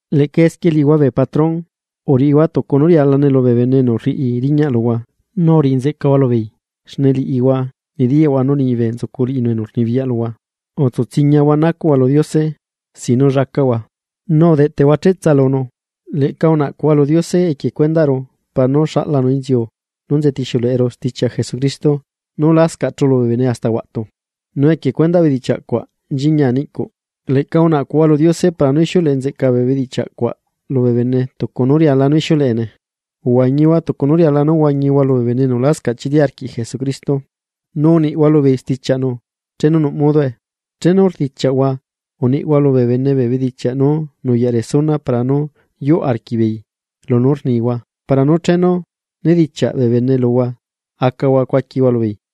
Leꞌca esquie liꞌihua bee patrón, uriꞌihua tucu nú rialane lubee bene enu rriꞌi riñaꞌ luhua nu uriꞌi nzeꞌcahua lubeei xne liꞌihua nediyaꞌhua nú liñibe nzucu liꞌinu enu rnibiyaꞌ luhua. Utsutsiñahua naꞌcuꞌhua lu Diose sin nú llacaꞌhua, nu udeꞌteꞌhua cheꞌtsa lunu. Leꞌca unaꞌcuhua lu Diose equie cuendaꞌru para nú xaꞌlanu inziu nú nzetixiuleꞌeru stichiaꞌ Jesucristo nú lascaꞌ chulu bee bene hasta huaꞌtu. Nu equie cuendaꞌ bedichiaꞌ cuaꞌ nchiñia niꞌcuꞌ. Leꞌca unaꞌcuhua lu Diose para nú ixiuleꞌe nzeꞌcaa bee bedichiaꞌ cuaꞌ lubee bene tucu nú riala nú ixiuleꞌene. Uhuañihua tucu nú riala nú huañihua lubee bene enu lascaꞌ chili arquiꞌ Jesucristo, nu uniꞌhua lubeei stichiaꞌnu chenu nuꞌ modoe. Chenu rdichiaꞌhua, uniꞌhua lubee bene bee bedichiaꞌ nú nuyaꞌ resuna para nú yuꞌ arquiꞌbeei lunú rnihua para nú chenu nedichiaꞌ bee bene luhua acahua cuaquihua lubeei.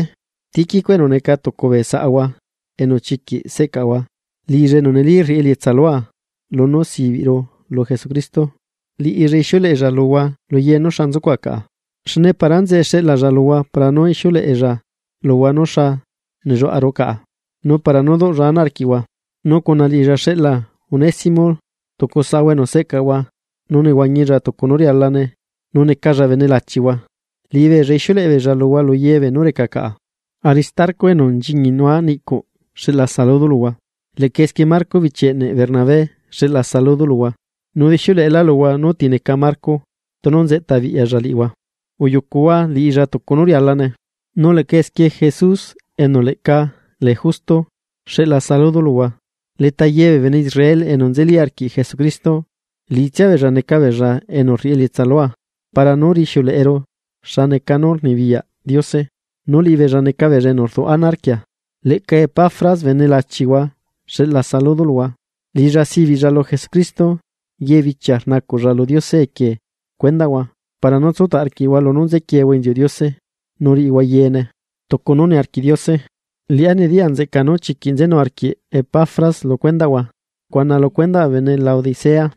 Tíquico, enu neca tucu bee saꞌahua enu chiquiꞌ seꞌcaꞌahua, liꞌilla enu neli rriꞌi elietsa lua lunú sibiꞌru lu Jesucristo, liꞌilla ixiuleꞌella luhua lu ye nú xa nzucuꞌa caꞌa. Xne para enzeꞌe xeꞌlaalla luhua para nú ixiuleꞌella luhua nú xa nelluaꞌaru caꞌa, nu para nú duꞌlla ana arquiꞌhua. Nu cuna liꞌilla xeꞌla Onésimo, tucu saꞌhua enu seꞌcaꞌahua nu nehuañilla tucu nú rialane nu necalla bene lachihua. Liꞌibeella ixiuleꞌebeella luhua lu ye beenú reca caꞌa. Aristarco, enu nchiñinua niꞌcuꞌ xeꞌla saludo luhua. Leꞌca esquie Marco bichi eꞌne Bernabé xeꞌla saludo luhua, nu udixiuleꞌelá luhua nú ti neca Marco tunu nzeꞌtabiꞌyalla liꞌihua, uyucuhua liꞌilla tucu nú rialane. Nu leꞌca esquie Jesús enu leꞌca lee Justo, xeꞌla saludo luhua. Leta ye bee bene Israel enu nzeli arquiꞌ Jesucristo, liꞌitsia beella neca beella enu rriꞌi elietsa lua para nú rixiuleꞌeru xa neca nú rnibiyaꞌ Diose, nu liꞌibeella neca beella enu rduꞌ ana arquia. Leꞌca Epafras bene lachihua xeꞌla saludo luhua. Liꞌilla sibiꞌlla lu Jesucristo, yee bichia rnacuꞌlla lu Diose equie cuendaꞌhua para nú tsutaꞌ arquiꞌhua lunú nzequiehua inziuꞌ Diose nu riꞌihua beyaꞌ yeene tucu nú niarquiꞌ Diose. Liꞌá nediya nzeꞌca nú chiquiꞌ nzenu arquiꞌ Epafras lu cuendaꞌhua, cuna lu cuendaꞌ bee bene Laodicea,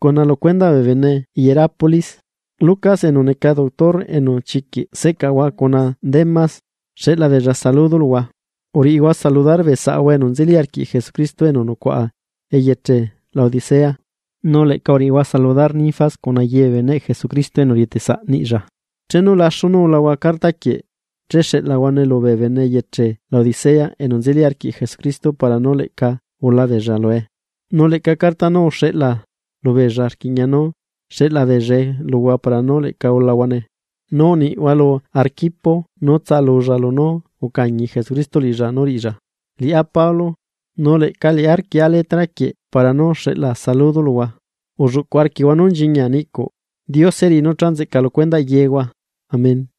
cuna lu cuendaꞌ bee bene Hierápolis. Lucas enu neca doctor enu chiquiꞌ seꞌcaꞌahua cuna Demas, xeꞌla beella saludo luhua. Uriꞌihua saludar bee saꞌahua enu nzeli arquiꞌ Jesucristo enu nucuaꞌa eyeche Laodicea, nu leꞌca uriꞌihua saludar Ninfas cuna ye bee beneꞌ Jesucristo enu rieteꞌ saꞌ niꞌlla. Chenu laxu nú ulahua carta quieꞌ, che xeꞌlahuane lubee bene eyeche Laodicea enu nzeli arquiꞌ Jesucristo para nú leꞌca ula beella lue. Nu leꞌca carta nú uxeꞌla lubeella rquiꞌña nú xeꞌla beellae luhua para nú leꞌca ulahuane. Nu uniꞌhua lu Arquipo nú tsalulla lunú ucañi Jesucristo liꞌilla nú riꞌilla. Liꞌá Pablo, nu leꞌca liꞌá rquieꞌa letra quieꞌ para nú xeꞌla saludo luhua. Ulluꞌcuꞌ arquiꞌhua nú nchiñia niꞌcuꞌ. Diose riꞌi nú cha nzeꞌca lu cuendaꞌ yeehua. Amén.